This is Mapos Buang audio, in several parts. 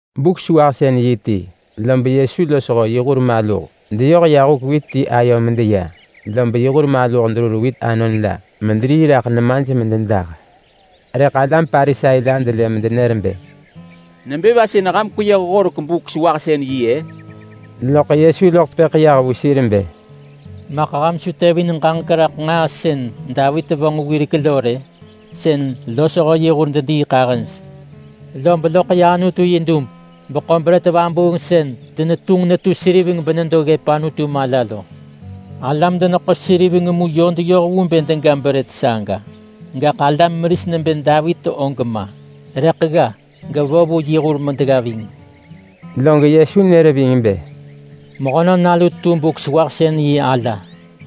Buk-sewahsën-yi ti, lob Yesu losho yi hur maluh deyoh ya huk wit ti ayo medeya. Lob yi hur maluh derur wit anon la mederii raḳ nemaj mededah. Rëḳ alam Parisai la delë medenër bë, “Nebë va sën ham kweyëh horek Buk-sewahsën-yi-ë?” Loḳ Yesu loḳ tepëḳ yah vu sir bë, “Maḳ ham su tevin ġaġek raḳ nġaa sën Davit vonġ wirek lo rë? Sën losho yi hur dediiḳahëj lo, lob loḳ ya Anutu yi dub beḳo brët vabuung sën denetunġ netu seriveng benedo ggëp Anutu mala lo. Alam-deneḳo-seriveng mu yö deyoh vu bë dega brët saga, gaḳ alam meris nebë Davit og ma. Rëḳ gga gevo vu yi hur medegga ving.” Log Yesu nër ving bë, “Mehönon Nalu tu Buk-sewahsën-yi ala.”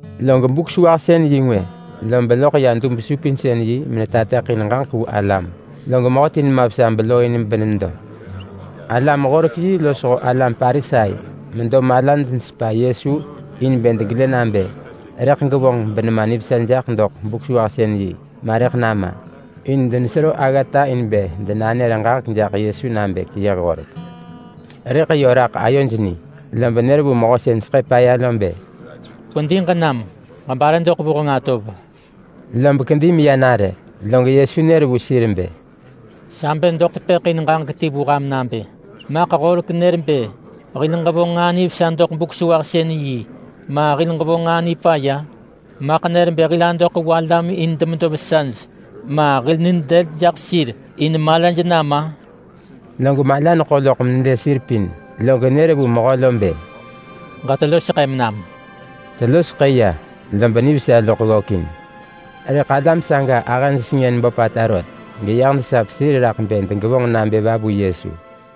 Log Buk-sewahsën-yi ngwë, lob loḳ ya dub-supinsën-yi menetateḳin ġaġek vu alam. Log mehöti nema vesa belooin benedo. Alam-horek-yi losho alam Parisai medo malaj nesepa Yesu in bë degelë nabë rëḳ gevonġ benema nivesa jaḳ doḳ Buk-sewahsën-yi, ma rëḳ nama! In denesero aggata in bë denanër ġaġek jaḳ Yesu nabë keyëh horek. Rëḳ yö raḳ ayoj ni. Lob nër vu mehö sën seḳë paya lo bë, “Kwedi ġenam ġebare doḳ vuheng atov.” Lob kedi meya nare. Log Yesu nër vu sir bë, “Sa bë doḳ tepëḳ in ġaġek ti vu ham nabë: Maḳ horek nër bë hil ġevonġ nġaa nivesa doḳ Buk-sewahsën-yi, ma hil ġevonġ nġaa nipaya? Maḳ nër bë hil adoḳ vu alam in demedo vesaj, ma hil nid dël jaḳ sir in malaj nama?” Log mala neḳo loḳ menelë sir pin, log nër vu mehö lo bë, “Ġetelo seḳëm nam!” Telo seḳë ya, lob nivesa loḳ ggökin. Rëḳ alam saga ahëj sengën böpata rot, geyah desap sir raḳ bë degevonġ nabë va vu Yesu!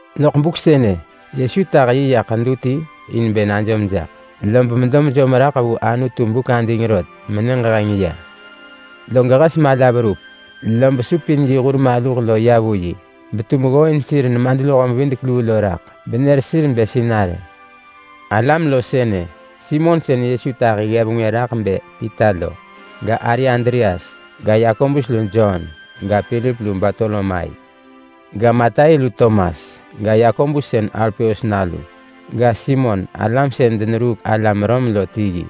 Loḳ buk sënë, Yesu tah yi ya ḳedu ti in bë najom jaḳ, lob medo mejom raḳ vu Anutu buk ading rot menyëġ heng ya. Log hes mala verup, lob supin yi hur maluh ya vu yi, betum ggooin sir nemadluho-mevidek-luu lo raḳ benër sir bë Sinarë. Alam lo sënë: Simon sën Yesu tahi ggev ngwë raḳ bë Pita lo. Ga, ari Andreas. Ga, Yakobus lu Jon. Ga, Pilip lu Bartolomai. Ga, Matai lu Tomas. Ga, Yakobus sën Alpeus nalu. Ga, Simon sën yi mehö-neruuk-alam-Rom lo.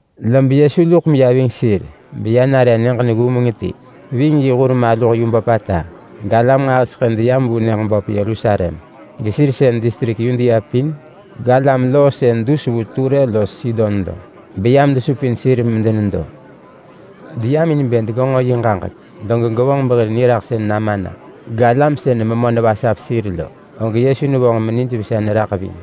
Lob Yesu luḳ meya ving sir beya nare nyëġ neggumeng ti ving yi hur maluh yu böpata. Galam nġahiseḳë deyam vu nyëġ böp Yerusalem, gesir sën distrik Yudea pin, galam loo sën dus vu Ture los Sidon lo beyam desupin sir medenedo. Deyam in bë degenġo yi ġaġek, log gevonġ behir niraḳsën nama na. Galam sën memö nevasap sir lo, og Yesu nevonġ menijvesa neraḳ ving.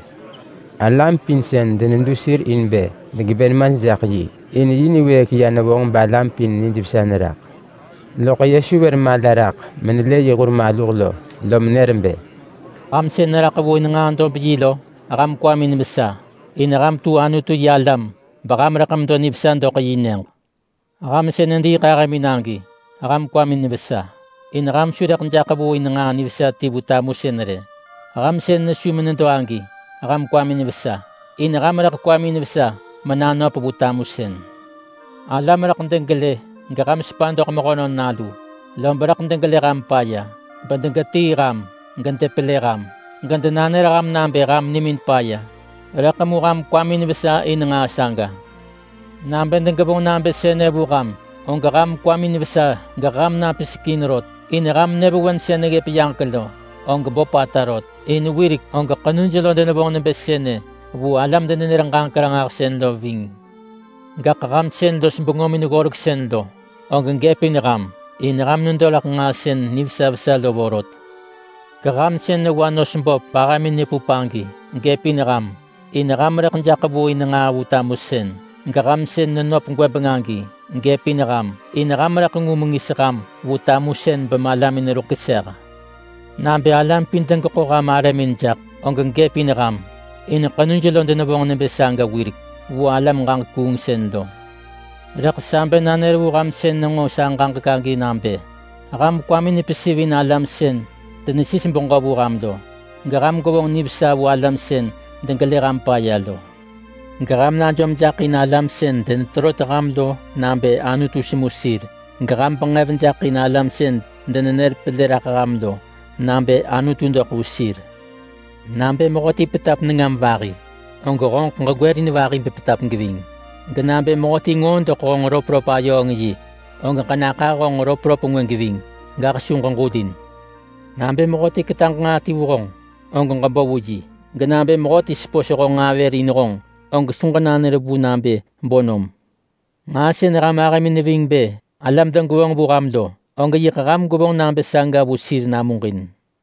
Galam pin denedu sir in bë degebë nemaj jaḳ yi. In yi niwëëk ya nevonġ balam pin nijvesa neraḳ. Loḳ Yesu vër mala raḳ menelë yi hur maluh lo, lom nër bë: “Ham sën neraḳ vu in nġaa dob-yi lo, ham kwamin vesa. In ham tu Anutu-yi-alam beham rëḳ medo nivesa doḳ yi nyëġ. Ham sën nediiḳahëmin agi, ham kwamin vesa. In ham su rëḳ jaḳ vu in nġaa nivesa ti vu tamusën rë. Ham sën nesu menedo agi, ham kwamin vesa. In ham rëḳ kwamin vesa menanöp vu tamusën. Alam rëḳ degelë geham sepa doḳ Mehönon Nalu, lob rëḳ degelë ham paya, bedegetii ham, gedepelë ham, gedenanër ham nabë ham nimin paya, rëḳ mu ham kwamin vesa in nġaa saga. Nabë degevonġ nabë sënë vu ham, og ham kwamin vesa, geham napisek in rot, in ham nyëvewen sën neggëp yaġek lo, og böpata rot. In wirek og ḳenuj lo denevonġ nebë sënë vu alam-denenër-ġaġek-ranġahsën lo ving. Gaḳ ham sën los bengömin-ggoreksën lo, og gëpin ham! In ham nedo raḳ nġaa sën nivesa vesa lo vorot. Geham sën newa nos böp bahëmin nepup agi, gëpin ham! In ham rëḳ jaḳ vu in nġaa vu tamusën. Geham sën nenöp gwëbeng agi, gëpin ham! In ham rëḳ ngu mengis ham vu tamusën bemalamin ruḳ keseh. Nabë alam pin degeḳo ham arëmin jaḳ, og gëpin ham! In ḳenuj lo denevonġ nebë saga wirek vu alam-ġaġek-kuungsën lo.” “Rëḳ sa bë nanër vu ham sën nenġo sa ġaġek agi nabë: Ham kwamin pesivin alam sën denesis beġö vu ham lo. Geham gwevonġ nivesa vu alam sën degelë ham paya lo. Geham najom jaḳ in alam sën deneterot ham lo nabë Anutu semu sir. Geham benġev jaḳ in alam sën denenër pelë raḳ ham lo nabë Anutu doḳ vu sir. Nabë mehöti petap nengam vahi, og honġeḳ ġegwërin vahi bepetap geving. Genabë mehöti ngoo doḳ honġ röpröp-ayööng-yi, og ġenaḳah honġ röpröp ngwë geving, gaḳ su ġeġulin. Nabë mehöti ketaġ nġaa ti vu honġ, og ġebo vu yi. Genabë mehöti sepos honġ nġaa vër in honġ, og su ġenanër vu nabë bo nom. Nġaa sën ham ahëmin neving bë alam degevonġ vu ham lo, og yiḳ ham gwevonġ nabë saga vu sir namuġin.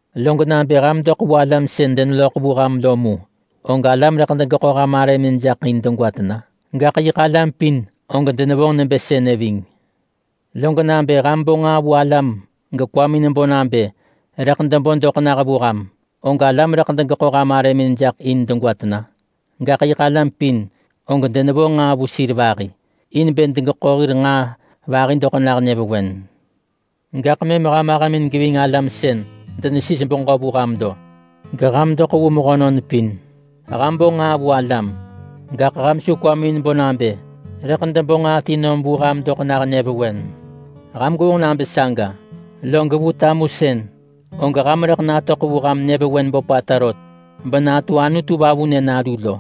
Log nabë ham doḳ vu alam sën deneloḳ vu ham lo mu, og alam rëḳ degeḳo ham arëmin jaḳ in degwa tena? Gaḳ yiḳ alam pin og denevonġ nebë sënë ving. Log nabë ham bo nġaa vu alam gekwamin bo nabë rëḳ debo doḳ nah vu ham, og alam rëḳ degeḳo ham arëmin jaḳ in degwa tena? Gaḳ yiḳ alam pin og denevo nġaa vu sir vahi, in bë degeḳo hir nġaa vahi doḳ nah nyëvewen. Gaḳ mëm ham ahëmin geving alam sën denesis beġö vu ham lo. Geham doḳ vu mehönon pin. Ham bo nġaa vu alam, gaḳ ham su kwamin bo nabë rëḳ debo nġaa ti nom vu ham doḳ nah nyëvewen. Ham gwevonġ nabë saga, log vu tamusën, og ham rëḳ natöḳ vu ham nyëvewen böpata rot benatu Anutu Vavunë nalu lo.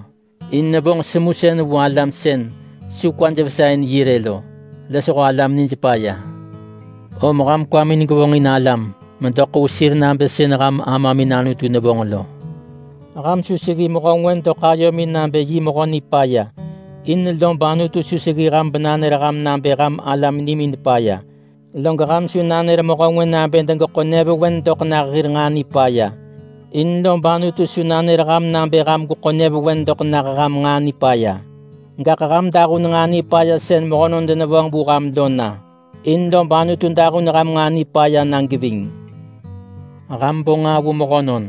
In nevonġ semusën vu alam sën su kwaj vesa in yi rë lo, losho alam nij paya. Om ham kwamin gevonġin alam medoḳ vu sir nabë sën ham Amamin Anutu nevonġ lo.” “Ham su seggi mehö ngwë doḳ ayomin nabë yi mehö nipaya. In lob Anutu su seggi ham benanër ham nabë ham alam nimin paya. Log ham su nanër mehö ngwë nabë degeḳo nyëvewen doḳ nah hir nġaa nipaya. In lob Anutu su nanër ham nabë ham gweḳo nyëvewen doḳ nah ham nġaa nipaya. Gaḳ ham dahun nġaa nipaya sën mehönon denevonġ vu ham lo na, in lob Anutu dahun ham nġaa nipaya na geving. Ham bo nġaa vu mehönon,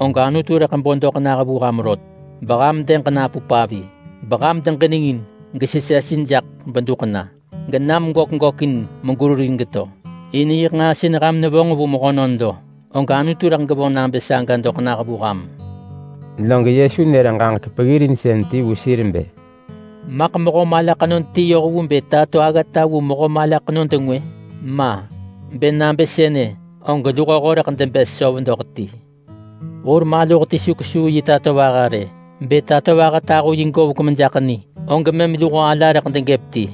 og Anutu rëḳ bo doḳ nah vu ham rot, beham dëg napup avi, beham deġinengin gesesesin jaḳ beduḳ na, genam gök gökin megerurin geto. In yiḳ nġaa sën ham nevonġ vu mehönon lo, og Anutu rëḳ gevonġ nabë saga doḳ nah vu ham.” Log Yesu nër ġaġek peggirinsën ti vu sir bë, “Maḳ mehö mala ḳenod ti yoh vu bë tato aggata vu mehö mala ḳenod ngwë? Ma! Bë nabë sënë, og luhoho rëḳ debës söv doḳ ti. Hur maluh ti su kesuu yi tatovaha rë. Bë tatovaha tahu yi govek mejaḳ ni, og mëm luho ala rëḳ degëp ti.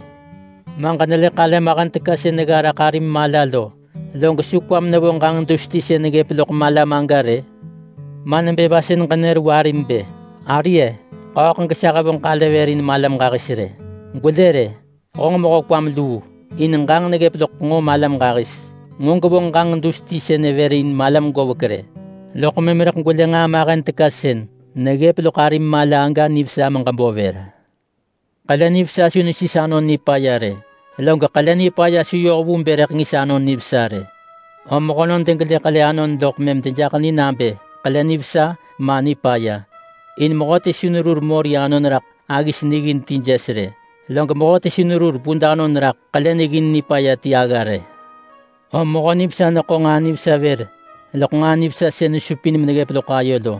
Ma ġenelë ḳale mahen teka sën negga raḳ arim mala lo, log su kwam nevo ġanġ dus ti sën neggëp loḳ malam aga rë? Ma nebë va sën ġenër vu arim bë, ‘Ari-e! Ḳööḳ gesa hevonġ ḳale vër in malam ġahis rë.’ Gwelë rë! Honġ mehö kwam luu! In ġanġ neggëp loḳ nġo malam ġahis! Nġo gwevonġ ġanġ dus ti sënë vër in malam govek rë, loḳ mëm rëḳ gwelë nġaa mahen teka sën neggëp loḳ arim mala aga nivesa meġebo vër.” “Ḳele nivesa su nesis anon nipaya rë. Log ḳele nipaya su yoh vu bë rëḳ ngis anon nivesa rë. Om mehönon degelë ḳele anon, loḳ mëm dejaḳ ni nabë ḳele nivesa, ma nipaya. In mehöti su nerur mori anon raḳ aggis niggin ti jes rë. Log mehöti su nerur vud anon raḳ ḳele niggin nipaya ti agga rë. Om mehö nivesa neḳo nġaa nivesa vër loḳ nġaa nivesa sën nesupin meneggëp loḳ ayo lo,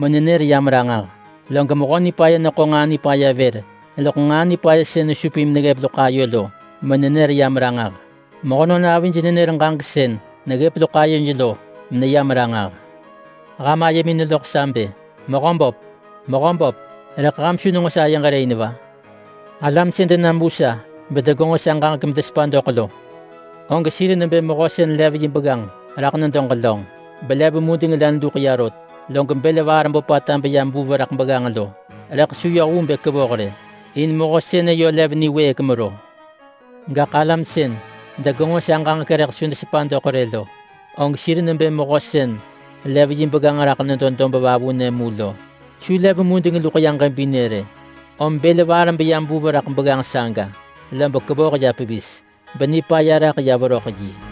menenër yam ranġah. Log mehö nipaya neḳo nġaa nipaya vër loḳ nġaa nipaya sën nesupin meneggëp loḳ ayo lo, menenër yam ranġah. Mehönon avij nenër ġaġek sën neggëp loḳ ayoj lo, meneyam ranġah.” “Ham ayemin neloḳ sa bë, ‘Mehöböp, Mehöböp!’ rëḳ ham su nenġo sayeġ rë in va? Alam sën denam vu sa bedegenġo sa ġaġek bedesepa doḳ lo og sir nebë mehö sën lev yi begganġ raḳ nedo ġelönġ böp, belev mudeng len luḳ ya rot. Log bël vaar böpata beya mevuv raḳ begganġ lo, rëḳ su yoh vu bë kevoh rë. In mehö sënë yö lev niwëëk mero. Gaḳ alam sën degenġo sa ġaġek rëḳ su desepa doḳ rë lo, og sir nebë mehö sën lev yi begganġ raḳ nedo dob vavunë mu lo. Su lev mudeng luḳ ya ġebinë rë, om bël vaar beya mevuv raḳ begganġ saga, lob kevoh ya pevis, benipaya raḳ ya veröḳ yi.”